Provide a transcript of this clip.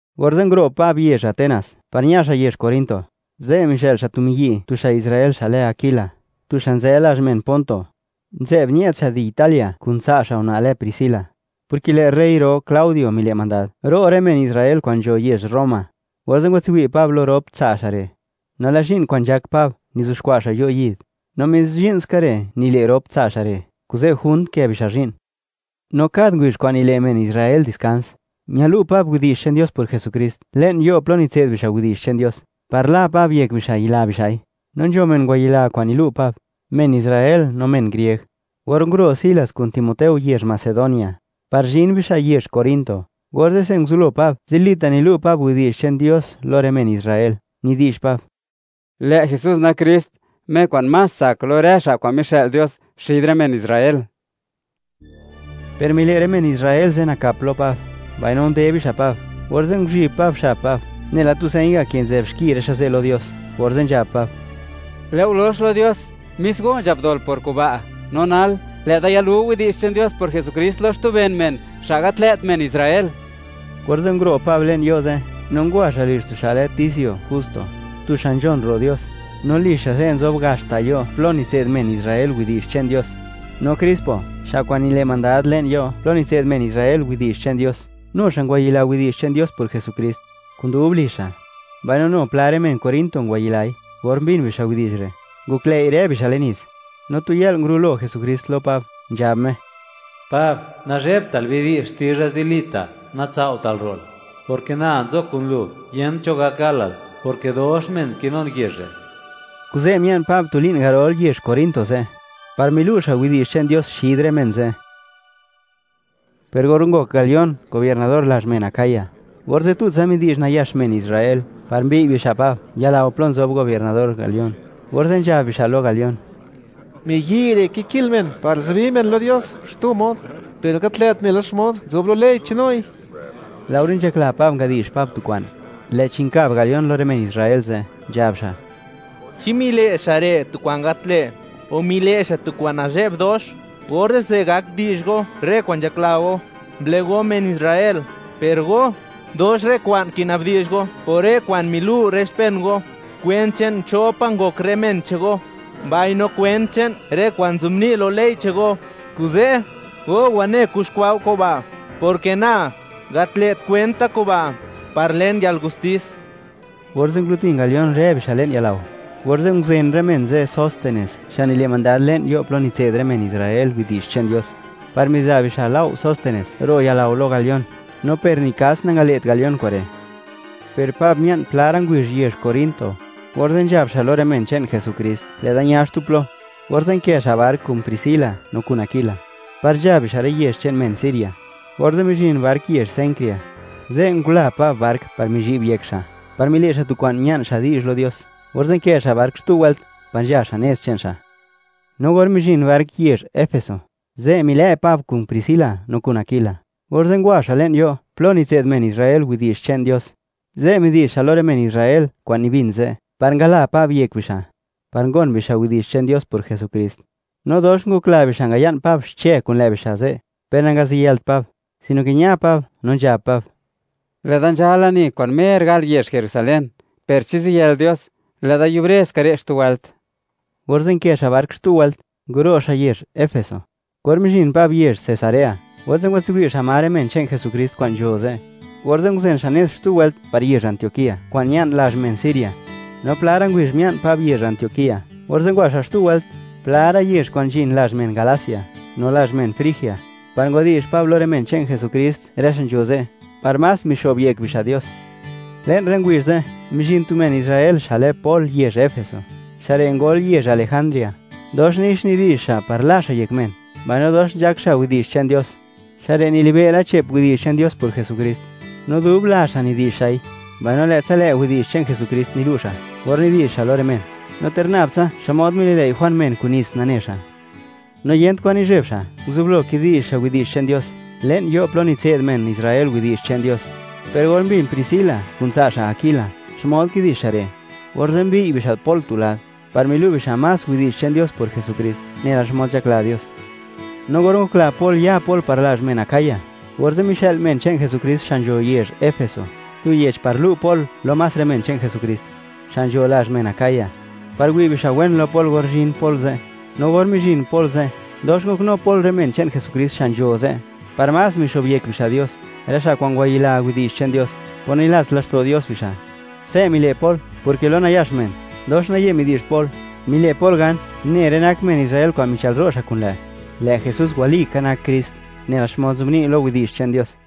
Orze' nguro' Pab yezh Atenas, par ña xa' yezh Corinto. Ze' mizhë'l xa' tu miyi' tu xa' Israel xa' lë Aquila, tu xa' nzë lazh men Ponto; nzë'b ñë'd xa' di Italia kun tsa' xa' una' lë Priscila, porke lë' rey ro Claudio mile' mandad, ro' rë men Israel kwa'n nzho yezh Roma. Orze' ngwatswi' Pab lo rop tsa' xa' re'. No lë' zhi'n kwa'n nzhak Pab nizuxkwa' xa' yo' yid, no mis zhi'n ska re' nile' rop tsa' xa' re', kuze' junt nkë bixa' zhi'n. No kad ngubizh kwa'n nile' men Israel diskans, ñalu' Pab widi'zh che'n Dios por Jesukrist le'n yo' plo nitse'd bixa' widi'zh che'n Dios, par la Pab yek bixa' yila bixa'i, no nzho men ngwayila kwa'n milu' Pab, men Israel no men grieg. Or nguro' Silas kun Timoteo yezh Macedonia, par zhin bixa' yezh Corinto, orze'se nguzublo Pab, zilita' nilu' Pab widi'zh che'n Dios lo rë men Israel, nidi'zh Pab: “Lë' Jesús nak Krist, Me kwa'n más tsak lo rë xa' kwa'n mixë'l Dios xid rë men Israel.” Per mile' rë men Israel ze' nakap lo Pab, mbaino nde bixa' Pab, orze' nguzhib Pab xab Pab nela tu señ ga' ke nzë'b xki rë xa' ze' lo Dios, orze' nzhab Pab: ―Lë'o lox lo Dios, mis go nzhap dol por kuba'. No nal, lë'da yalu widi'zh che'n Dios por Jesukrist lo xtu ben men, xa' gat lë't men Israel. Orze' nguro' Pab le'n yo' ze', no ngwa xa' lizh tu xa' lë Ticio Justo, tu xa' nzhon ro' Dios, no lizh xa' ze' nzob gax ta' yo' plo nitse'd men Israel widi'zh che'n Dios. No Crispo, xa' kwa'n nile' mandad le'n yo' plo nitse'd men Israel widi'zh che'n Dios; nu xa' ngwayila widi'zh che'n Dios por Jesukrist, kun dub lizh xa'. Mbaino nu pla rë men Corinto ngwayilai, or mbin bixa' widi'zh re', ngoklëi' rë bixa' le'n nits. No tu yë'l, ngurulo Jesukrist lo Pab, nzhab Me: ―Pab, nazhebtal; bidi'zh xtizha zilita', natsao'tal ro'l; porke na nzo kun lu, yent cho gak galal, porke dox men kinun yezh re'. Kuze' mia'n Pab tu li'n garol yezh Corinto ze', par milu' xa' widi'zh che'n Dios xid rë men ze'. Per or ngok Galión gobiernador lazh men Acaya, orze' tutsa midi'zh nayax men Israel, par mbiy' bixa' Pab yalao plo nzob gobiernador Galión. Orze' nzhab bixa' lo Galión: ―Miyi' re' kiki'l men par zubi men lo Dios xtu mod, per gat lë't nela xmod nzob lo ley che'n noi. Laore nzhakla Pab ngadi'zh Pab tu kwa'n, lë'chi nkab Galión lo rë men Israel ze', nzhab xa': ―Chi mile' xa' re' tu kwa'n gat lë', o mile' xa' tu kwa'n nazhe'b dox, orze'se gak di'zh go rë kwa'n nzhakla go, mblëgo men Israel; per go, dox rë kwa'n kinabdi'zh go por rë kwa'n milu' rë xpen go, kwent che'n cho pa' ngok rë men che'n go, mbaino kwent che'n rë kwa'n nzobni' lo ley che'n go. Kuze', go wane kuxkwa' go kuba', porke na, gat lë't kwent da kuba', par len yalgustis. Orze' ngulutin Galión rë bixa' le'n yalao. Orze' nguzen rë men ze' Sóstenes, xa' nile' mandad le'n yo' plo nitse'd rë men Israel widi'zh che'n Dios, par miza' bixa' lao' Sóstenes, ro' yalao lo Galión, no per ni kas nangale't Galión kure'. Per Pab mia'n pla ra' ngubizh yezh Corinto. Orze' nzhab xa' lo rë men che'n Jesukrist: “Lë'da ña xtu plo.” Orze' nkë xa' bark kun Priscila no kun Aquila, par nzha bixa' rë yezh che'n men Siria. Orze' mizhin bark yezh Cencrea, ze' ngula Pab bark par mizhi'b yek xa', par mile' xa' tu kwa'n mia'n xa' di'zh lo Dios. Orze' nkë xa' bark xtu wëlt par nzha xa' nez che'n xa'. No or mizhin bark yezh Efeso, ze' milë' Pab kun Priscila no kun Aquila, orze' ngwa xa' le'n yo' plo nitse'd men Israel widi'zh che'n Dios. Ze' midi'zh xa' lo rë men Israel kwa'n nibin ze' par ngala Pab yek bixa', par gon bixa' widi'zh che'n Dios por Jesukrist. No dox ngokla bixa' ngaya'n Pab xche kun lë' bixa' ze', per nangaziyëlt Pab, sino ke ña Pab, no nzhab Pab: ―Lë'da nzha lani kwa'n mer gal yezh Jerusalén, per chi ziyël Dios, lë'da yubre ska re' xtu wëlt. Orze' nkë xa' bark xtu wëlt, nguro' xa' yezh Efeso. Or mizhin Pab yezh Cesarea, orze' ngwatswi' xa' ma rë men che'n Jesukrist kwa'n nzho ze'. Orze' nguzen xa' nez xtu wëlt par yezh Antioquía, kwa'n ña'n lazh men Siria. No pla ra' ngubizh mia'n Pab yezh Antioquía, orze' ngwa xa' xtu wëlt pla ra' yezh kwa'n nzhin lazh men Galacia no lazh men Frigia, par ngwadi'zh Pab lo rë men che'n Jesukrist rë xa' nzho ze', par más mixo'b yek bixa' Dios. Le'n rë ngubizh ze', mizhin tu men Israel xa' lë Pol yezh Efeso. Xa' re' ngol yezh Alejandría, dox nix nidi'zh xa' par la xa' yek men, mbaino dox nzhak xa' widi'zh che'n Dios. Xa' re' nilibe' la che'p widi'zh che'n Dios por Jesukrist, no dubla xa' nidi'zh xa'i, mbaino lë'tsa lë' widi'zh che'n Jesukrist nilu' xa' or nidi'zh xa' lo rë men, no ter nab tsa xmod mililëi' Juan men kun nits, nane xa'. No yent kwan nizheb xa', nguzublo kidi'zh xa' widi'zh che'n Dios, le'n yo' plo nitse'd men Israel widi'zh che'n Dios. Per or mbin Priscila kun tsa' xa' Aquila xmod kidi'zh xa' re', orze' mbiy' bixa' Pol tu lad, par milu' bixa' más widi'zh che'n Dios por Jesukrist nela xmod nzhakla Dios. No or ngokla Pol ya Pol par lazh men Acaya, orze' mixë'l men che'n Jesukrist xa' nzho yezh Efeso, tu yech par lu' Pol lo más rë men che'n Jesukrist, xa' nzho lazh men Acaya, par wi' bixa' wen lo Pol or zhin Pol ze'. No or mizhin Pol ze', dox ngoknu Pol rë men che'n Jesukrist xa' nzho ze', par más mixo'byek bixa' Dios, rë xa' kwa'n ngwayila widi'zh che'n Dios por nilats laxto' Dios bixa'. Se' mile' Pol, porke lo nayax men, dox naye midi'zh Pol, mile' Pol gan une rë nak men Israel kwa'n michëlro' xa' kun lë', lë' Jesús walika nak Krist, nela xmod nzobni' lo Yech che'n Dios.